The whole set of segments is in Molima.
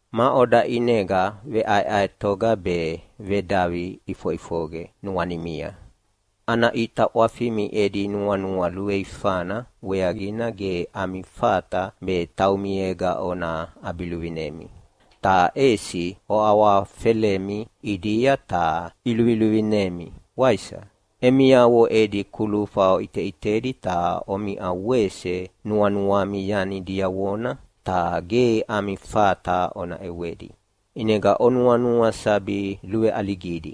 Maʼoda ʼinega veʼaeʼaetoga be vedavi ʼifoʼifoqe nuanimia? Ana ʼita ʼwafimi edi nuanua luveifana weaqina ge ami fata be taumiega ona ʼabiluvinemi, ta ʼesi oawahawafelemi ʼidia ta iluviluvinemi, waisa? Emiavo edi kulufa oʼiteʼitedi ta omiʼa wese nuanuami yani diavona, ta ge ami fata ona ʼewedi, ʼinega onuanua sabi luveʼaligidi.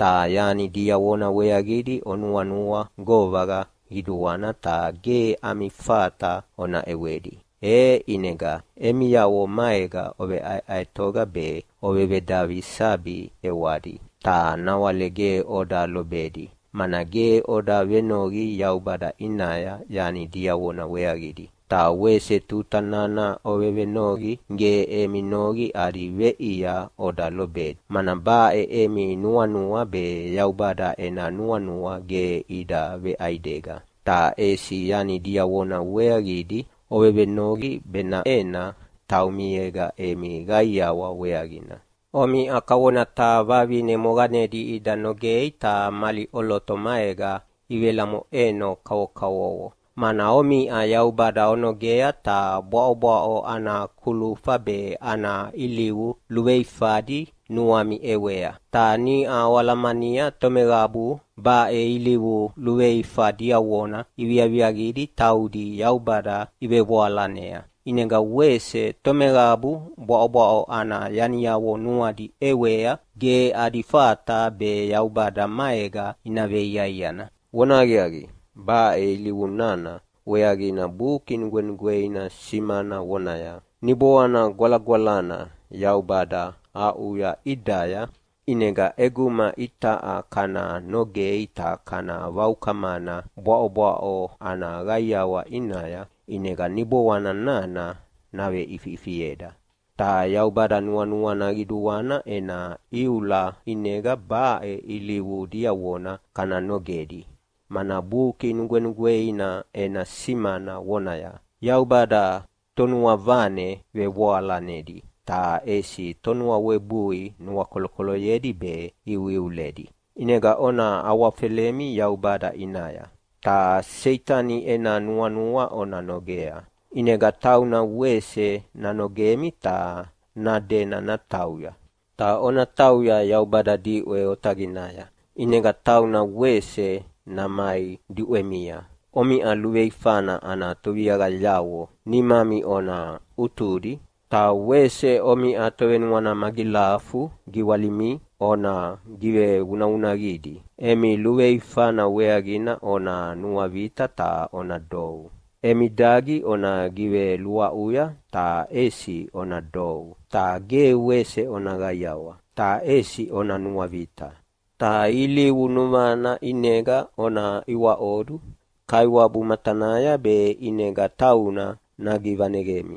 Ta yani diavona weaqidi onuanua govaqa qiduana ta ge ami fata ona ʼewedi, e ʼinega emiavo maega oveʼaeʼaetoga be ovevedavi sabi ʼewadi, ta nawale ge oda lobedi, mana ge oda venoqi Yaubada ʼinaya yani diavona weaqidi. Ta wese tuta nana ovevenoqi ge emi noqi adi veʼia oda lobedi, mana baʼe emi nuanua be Yaubada ena nuanua ge ida veʼaidega, ta ʼesi yani diavona weaqidi ovevenoqi benaʼena taumiega emi qaiawa weaqina. Omiʼa kavona taha vavine moqanedi ida nogei ta mali ʼoloto maega ivelamoʼeno kavokavovo, mana omiʼa Yaubada onogea ta bwaʼobwaʼo ana kulufa be ana ilivu luveifadi nuami ʼewea. Ta niʼa oalamania tomeqabu baʼe ilivu luveifa diavona iviaviaqia taudi Yaubada ivevoalanea. ʼInega wese tomeqabu bwaʼobwaʼo ana yaniavo nuadi ʼewea ge adi fata be Yaubada maega ina veiaiana. Vonahaqiaqi, baʼe ilivu nana weaqina Buki Nugwenugweina simana vonaya, “Niboana Gwalagwalana Yaubada aʼuya ʼidaya, ʼinegana ʼeguma itaʼa kana nogei ta kana vaukamana bwaʼobwaʼo ana qaiawa ʼinaya, ʼinega Niboana nana naveʼifiʼifieda.” Ta Yaubada nuanuana qiduana ena iula ʼinega baʼe ilivu diavona kana nogedi, mana Buki Nugwenugweina ena simana vonaya, “Yaubada tonuavane vevoalanedi ta ʼesi tonuawebui nuakolokoloyedi be iuiuledi.” ʼInega ona awafelemi Yaubada ʼinaya. Ta Seitani ena nuanua ona nogea, ʼinega tauna wese nanogemi ta nadena natauya. Ta ona tauya Yaubada diʼwe otaqinaya, ʼinega tauna wese namai diʼwemia. Omiʼa luveifana ana toviaqayavo nimami ona ʼutudi, ta wese omiʼa tovenuana magilafu giwalimi ona givevunavunaqidi. Emi luveifana weaqina ona nuavita ta ona dou. Emi dagi ona giveluaʼuya, ta ʼesi ona dou! Ta ge wese ona qaiawa, ta ʼesi ona nuavita! Ta ilivu nuvana ʼinega ona iwaʼodu Kaiwabu matanaya be ʼinega tauna nagivaneqemi.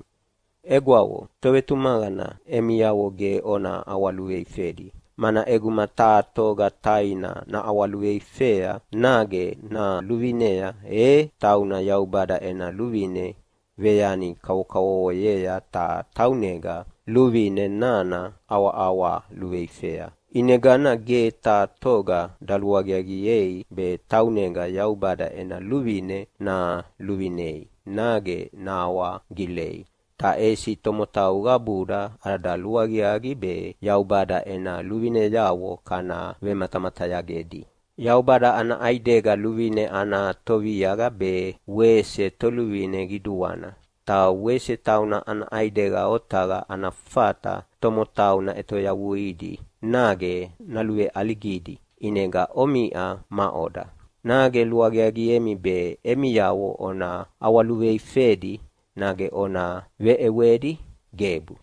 Egwavo, tovetumaqana emiavo ge ona ʼawaluveifedi, mana ʼeguma taha toga taina naʼawaluveifea nage naluvinea e tauna Yaubada ena luvine veyani kavokavovoyea ta taunega luvine nana ʼawaʼawa luveifea. ʼInegana ge taha toga daluaqiaqiei be taunega Yaubada ena luvine naluvinei nage nahawagilei. Ta ʼesi tomotau qabuda ada luaqiaqi be Yaubada ena luvineavo kana vematamatayagedi. Yaubada ana ʼaidega luvine ana Toviaqa be wese Toluvine Qiduana. Ta wese tauna ana ʼaidega otaqa ana fata tomotau naʼetoyavuidi nage naluveʼaligidi. ʼInega omiʼa maʼoda, nage luaqiaqiemi be emiavo ona ʼawaluveifedi nage ona veʼewedi? Gebu!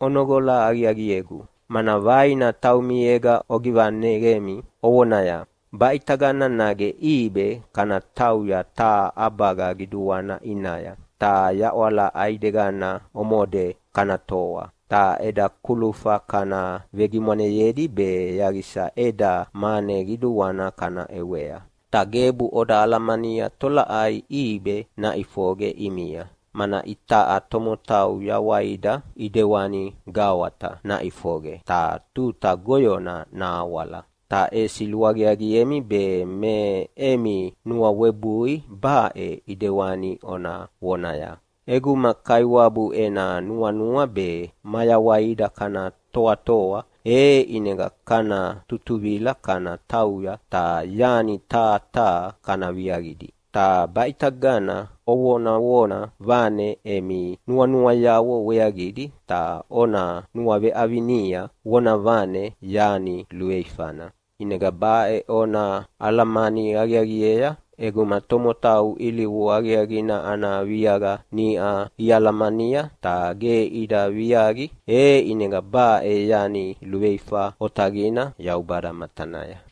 Onoqola aqiaqiegu, mana vaina taumiega ogivaneqemi ovonaya, “Baʼitagana nage ʼibe kana tauya taha ʼabaga qiduana ʼinaya, ta yaʼwala ʼaidegana omode kana toa, ta eda kulufa kana vegimwaneyedi be yaqisa eda mane qiduana kana ʼewea.” Ta gebu oda alamania tolaʼai ʼibe naʼifoqe ʼimia, mana itaʼa tomotau yawaida ʼidewani gawata naʼifoqe ta tuta goyona nahawala. Ta ʼesi luaqiaqiemi be me emi nuawebui baʼe ʼedewani ona vonaya, “ʼEguma Kaiwabu ena nuanua be mayawaida kana toatoa, e ʼinega kana tutuvila kana tauya ta yani taha taha kana viaqidi.” Ta baʼitagana ovonavona vane emi nuanuayavo weaqidi, ta ona nuaveʼavinia vonavane yani luveifana. ʼInega baʼe ona alamani aqiaqiea: ʼEguma tomotau ilivu aqiaqina ana viaqa niʼa ialamania ta ge ida viaqi, e ʼinega baʼe yani luveifa otaqina Yaubada matanaya.